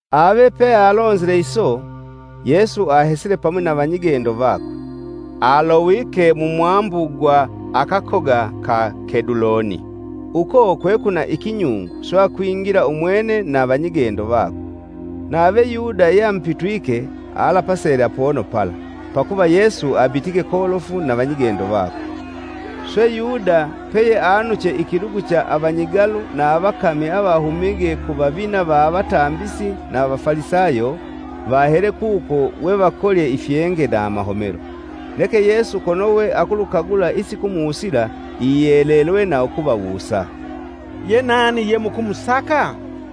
Ave pealonzile iso, Yesu ahesile pamwi na vanyigendo vakwe. Alowike mu mwambu gwa akakoga ka Keduloni, uko kwekwina ikinyungu swe akwingila umwene na vanyigendo vakwe. Nave Yuda, yeamupitwike alapasele apono pala, Pakuva Yesu abitige kolofu na vanyigendo vakwe. Swe, Yuda peyeanuche ikilugu cha avanyigalu na avakami avahumige ku vavina va avatambisi na Avafalisayo vahele kuko we vakolye ifyenge na amahomelo. Neke Yesu kono weakulukagula isikumusila iyelelwe na ukuvawusa, “Yenani ye mukumusaka?”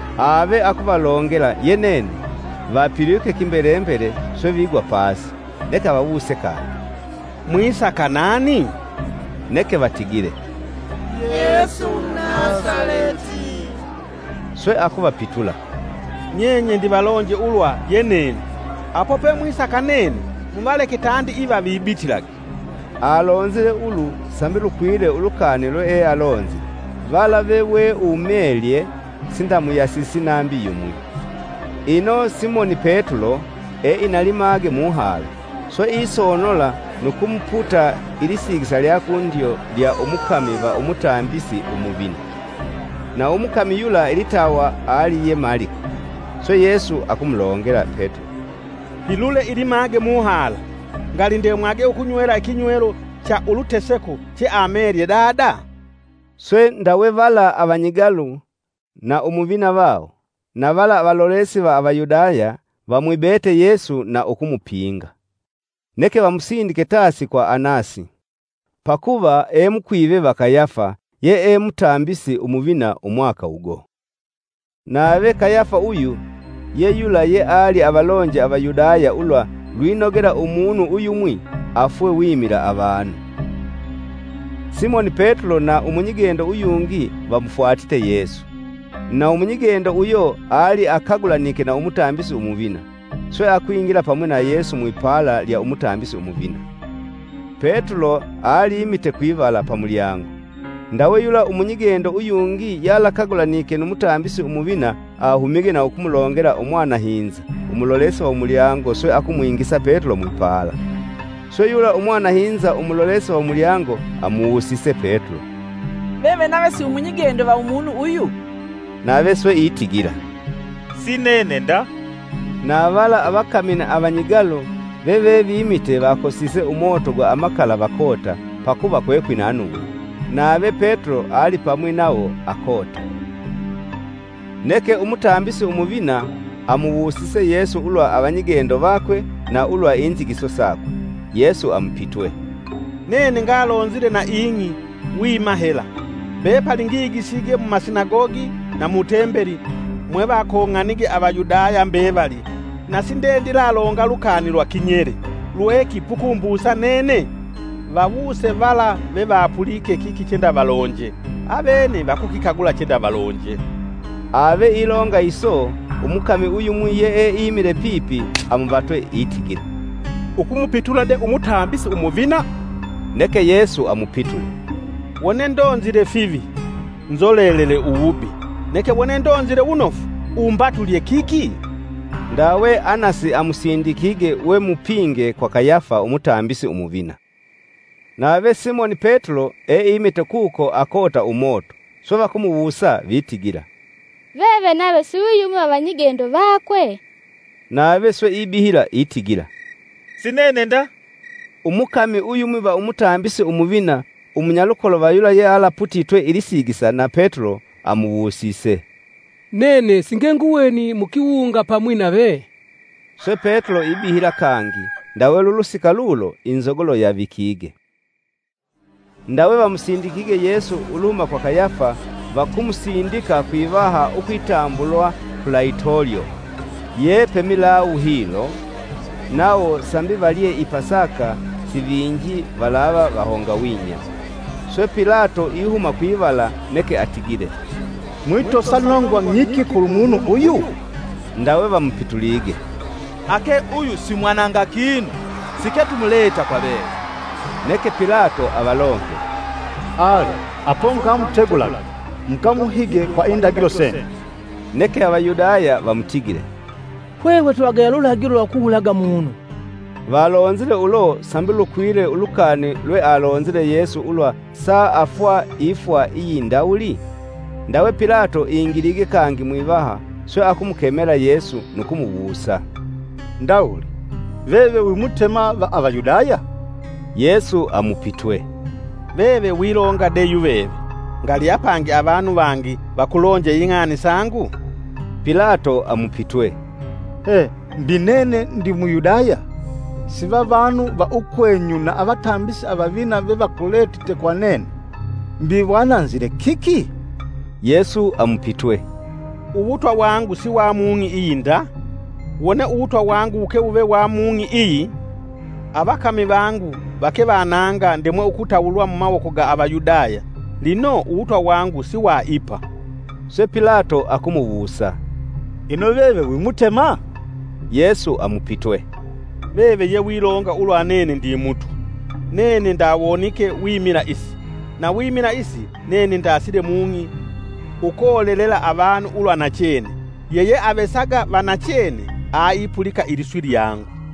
Ave akuvalongela, “Ye nene.” Vapilwike kimbele mbele swe vigwa pasi. Neke avawuse kangi, “Mwisaka nani?” Neke vatigile, “Yesu Umunasaleti!” Swe akuvapitula, “Nyenye ndivalonje ulwa ye nene. Apo pemwisaka nene, muvaleke tandi iva vibitilage.” ( Alonzile ulu sambi lukwile ulukani lweealonzile, “Vala veweumelye sindamuyasisi nambi yumwi.”) Ino Simoni Petulo, eina limage muhala, swe isonola nu kumuputa ilisigisa lya kundyo lya umukami va umutambisi umuvina. Na umukami yula ilitawa ali ye Maliko. Swe, Yesu akumulongela Petulo, “Pilule ilimage muhala. Ngali ndemwage ukunywela ikinywelo cha uluteseko cheamelye Dada?” Swe ndawe vala avanyigalu, na umuvina vawo, na vala avalolesi va Avayudaya vamwibete Yesu na ukumupinga neke vamusindike tasi kwa Anasi; pakuva e mukwive va Kayafa, yee mutambisi umuvina umwaka ugo. Nave Kayafa uyu ye yula yeali avalonje Avayudaya ulwa lwinogela umunu uyumwi afwe wimila avanu. Simoni Petulo na umunyigendo uyungi vamufwatite Yesu. Na umunyigendo uyo ali akagulanike na Umutambisi Umuvina, swe akwingila pamwi na Yesu mwipala lya Umutambisi Umuvina. Petulo aliimite kwivala, pamulyango. Ndawe yula umunyigendo uyungi yalakagulanike nu Mutambisi Umuvina ahumige na ukumulongela umwanahinza, umulolesi va umulyango swe akumwingisa Petulo mwipala. Swe yula umwanahinza umulolesi va umulyango amuwusise Petulo, “Veve nave si wimunyigendo va umunu uyu?” Nave swe itigila, “Si nene nda!” Navala avakami na avanyigalu veve vimite vakosise umoto gwa amakala vakota, pakuva kwekwina nungwi. nave Petulo alipamwi nawo akota. Neke Umutambisi Umuvina amuwusise Yesu ulwa avanyigendo vakwe na ulwa inzigiso sakwe. Yesu amupitwe, “Nene ngalonzile na ing'i wima hela. Mbepali ngigisige mumasinagogi na mu tembeli mwevakong'anige Avayudaya mbevali na sindendilalonga lukani lwa kinyele. Lweki pukumbusa nene? Vawuse vala vevapulike kiki chendavalonje, avene vakukikagula chendavalonje.” Ave ilonga iso umukami uyumwi yeeimile pipi amuvatwe itigila, “Ukumupitula de Umutambisi Umuvina?” Neke Yesu amupitule, “Wone ndonzile fivi, nzolelele uwubi, neke wone ndonzile wunofu, ‘Umbatulye kiki?’” Ndawe Anasi amusindikige, we mupinge, kwa Kayafa Umutambisi Umuvina. Nave Simoni Petulo eimite kuko akota umoto. Swe vakumuwusa vitigila, “Veve nave si wiyumwi va vanyigendo vakwe?” Nave swe ibihila itigila, “Sinene nda!” Umukami uyumwi va Umutambisi Umuvina, umunyalukolo va yula yealaputitwe ilisigisa na Petulo, amuwusise, “Nene singenguweni mu kiwunga pamwi nave?” Swe Petulo ibihila kangi, ndawe lulusika lulo inzogolo yavikige. Ndawe vamusindikige Yesu uluhuma kwa Kayafa, Vakumusindika Kwivaha, ukwitambulwa Pulaitolyo ye pe milawu hilo; nawo sambi valye i Pasaka sivinji valava vahongawinya. Swe Pilato ihuma kwivala neke atigile, “Mwitosa nongwa ng'iki kulumunu uyu?” Ndawe vamupitulige, “Ake uyu simwananga kinu siketumuleta kwa veve.” Neke Pilato avalongele, “Ale apo mukamutegulage, mukamuhige kwa indagilo senyu.” Neke Avayudaya vamutigile, “Hwehwe twivagaya lulagilo lwa ukuwulaga munu.” ( Valonzile ulo sambi lukwile ulukani lwealonzile Yesu ulwa saafwa ifwa iyindawuli?) Ndawe Pilato ingilige kangi mwivaha swe akumukemela Yesu nu kumuwusa, “Ndawuli, veve wi Mutema va Avayudaya?” Yesu amupitwe, “Veve wilonga de yuveve, ngali apangi avanu vangi vakulonje ing'ani sangu?” Pilato amupitwe, “He! Mbi nene ndi Muyudaya? Sivavanu va ukwenyu na Avatambisi Avavina vevakuletite kwa nene. Mbi wananzile kiki?” Yesu amupitwe, “Uwutwa wangu si wa mung'i iyi nda. Wone Uwutwa wangu wuke wuve wa mung'i iyi, avakami vangu vake vananga ndemwe ukutawulwa mumawoko ga Avayudaya. Lino, uwutwa wangu si wa ipa.” Swe Pilato akumuwusa, “Ino veve wi Mutema?” Yesu amupitwe, “Veve ye wilonga ulwa nene ndi Mutwa. Nene ndawonike wimila isi, na wimila isi nene ndasile mung'i ukolelela avanu ulwa nachene. Yeyeavesaga va nachene aipulika iliswi lyangu.”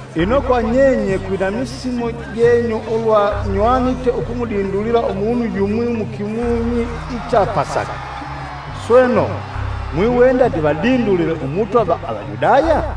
Ino kwa nyenye kwina misimu jenyu ulwa nywanite ukumudindulila umunu yumwi mukimunyi icha Pasaka. Sweno, mwiwenda ndivadindulile Umutwa va Avayudaya?”